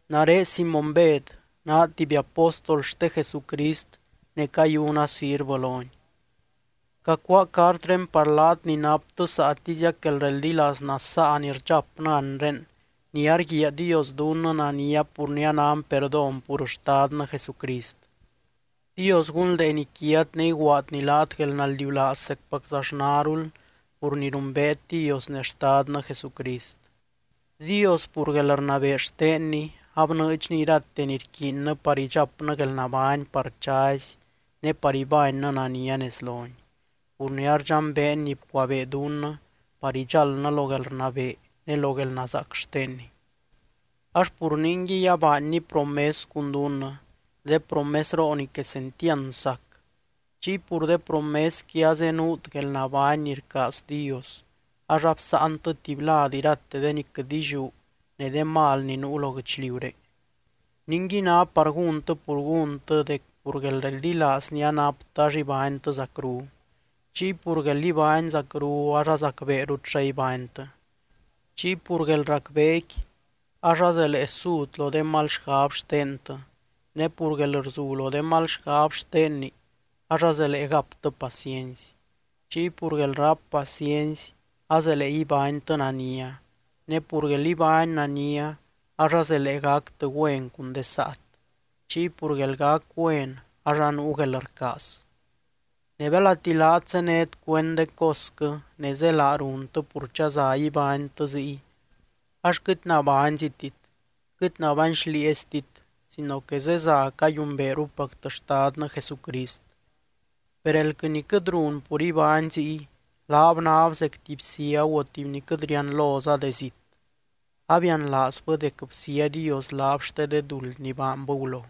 Nare Simóny Bed, naa tuby apóstol xte Jesucrist ne cayuna sirvɨ lony. Cacuáa cartré par laat ni naptɨ saatiziac guelreldilaaz nasaa ni rdxapnɨ anre ni arguiaa Dios dunnɨ nania pur ni anan perdón pur Xtadnɨ Jesucrist. Dios gunldeeny quiat ne iguaadny laat guelnaldiulaaz zecpaczaxnarul pur ni rumbeet Dios ne Xtadnɨ Jesucrist. Dios, pur guelrnabee xtenny, abnɨɨdxny irate ni rquiinnɨ par idxapnɨ guelnabány par chazy ne par ibánnɨ nania nez lony, pur ni ardxambeen ni bcuabee dunnɨ par idxáldnɨ lo guelrnabee ne lo guelnazaac xtenny. Ax pur ningui abaanny promes cun dunnɨ, de promesroo ni quesentiand sac. Chiy pur de promesqui azenuut guelnabány ni rcaaz Dios, ax absáantɨ tuby lad irate de ni quɨt illiú ne de mal ni nuu lo guɨchliuré. Ningui ná par gúntɨ pur gúntɨ dec pur guelreldilaaz ni anaptɨ ax ibánytɨ zacru. Chiy pur guel ibány zacru ax azacbeerut xa ibánytɨ. Chiy pur guelracbeequi ax azelee sut lo de mal xgab xtentɨ, ne pur guelrzu lo de mal xgab xtenni ax azelee gaptɨ paciency. Chiy pur guelráp paciency azelee ibánytɨ nania, ne pur guel ibány nania ax azelee gactɨ güen cun de saat. Chiy pur guelgac güen ax anuu guelrcaaz. Ne belati laat zénet cuend de cosquɨ ne zélaa runtɨ pur chaza ibánytɨ ziy, ax quɨt nabányzitit, quɨt nabány xlieeztit sino que zeza cayumbeerupactɨ Xtadnɨ Jesucrist. Per elquɨ ni quɨt run pur ibány ziy, laab náb zec tuby ciagu o tuby ni quɨt rianloza de zit. Abianlaazbɨ dec bsía Dios laab xte de duld ni baanbɨ gulo.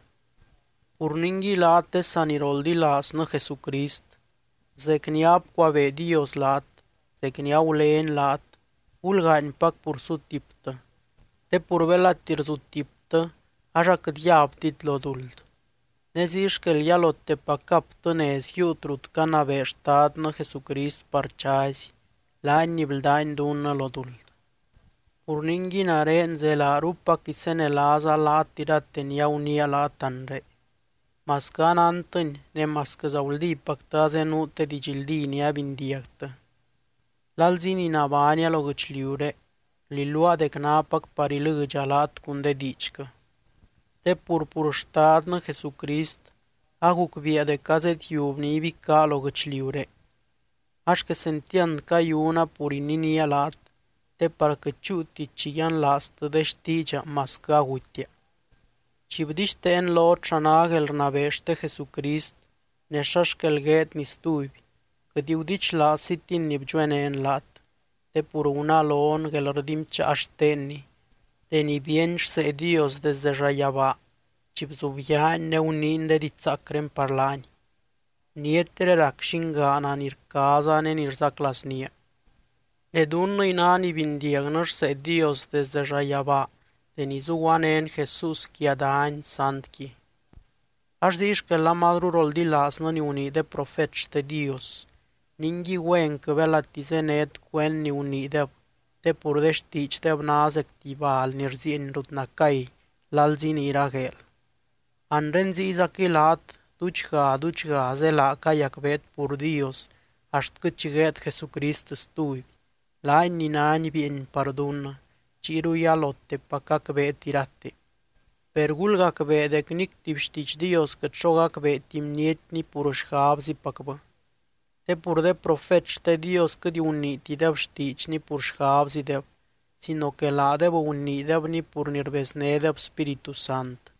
Pur ningui laat de saniroldilaaznɨ Jesucrist, zec ni abcuabee Dios laat, zec ni agulény laat, gulgaanypac pur sutiptɨ. Te pur belati rzutiptɨ ax aquɨt yabtit lo duld. Ne ziy xquel yalotepac gaptɨ nez yiiut rut canabee Xtadnɨ Jesucrist par chazy, laany ni bldány dunnɨ lo duld. Pur ningui nare zelaarupac isenelaaza laat irate ni aguniia laat anre, masquɨ anántɨni ne masquɨza guldípactɨ azenuut de didxldí ni abindiagtɨ. Lalzi ni nabánia lo guɨchliuré, rliluaa dec nápac par ilɨdxa laat cun de diidxquɨ. Te pur, pur Xtadnɨ Jesucrist agucbiia dec azedyiub ni ibicá lo guɨchliuré. Ax quesentiand cayuna pur ininía laat, te par quɨt chúuti chi yianlaaztɨ de xtiidxa masquɨ agutia. Chi bdixteen lot xa ná guelrnabee xte Jesucrist ne xa xquel gueedny stuby, quɨt gudichlaazzitin ni bdxuenén laat. Te pur gunalon guelrdinbcháa xtenny deni bíeny rsee Dios desde llayabaa, chi bzubyaany ne guniiny de diidx zaacré par laany: “Bnietré rac Llingaana ni rcaaza ne ni rzaclaaznía.” Ne dunnɨy ná ni bindiagnɨ rsee Dios desdɨ llayabaa deni zuguanén Jesús quia dany santqui. Ax ziy xquel amazru roldilaaznɨ ni gunii de profet xte Dios. Ningui, güenquɨ belati zénet cuend ni guniideb te pur de xtiidxdeb ná zec tuby bal ni rzieeny rut nacay lalzi ni iragueel. Anre ziyzaquɨy laat duudxga, duudxga zélaa cayacbeet pur Dios axtquɨ chi gueed Jesucrist stuby, laany ni nány bieeny par dunnɨ, chiyru yalotepac gacbeet irate. Per gulgacbee dec nic tuby xtiidx Dios quɨt xo gacbeeti bnietni pur xgabzipacbɨ. Te pur de profet xte Dios quɨt guniitideb xtiidxny pur xgabzideb sino que laadeb guniidebni pur ni rbeznédeb Spíritu Sant.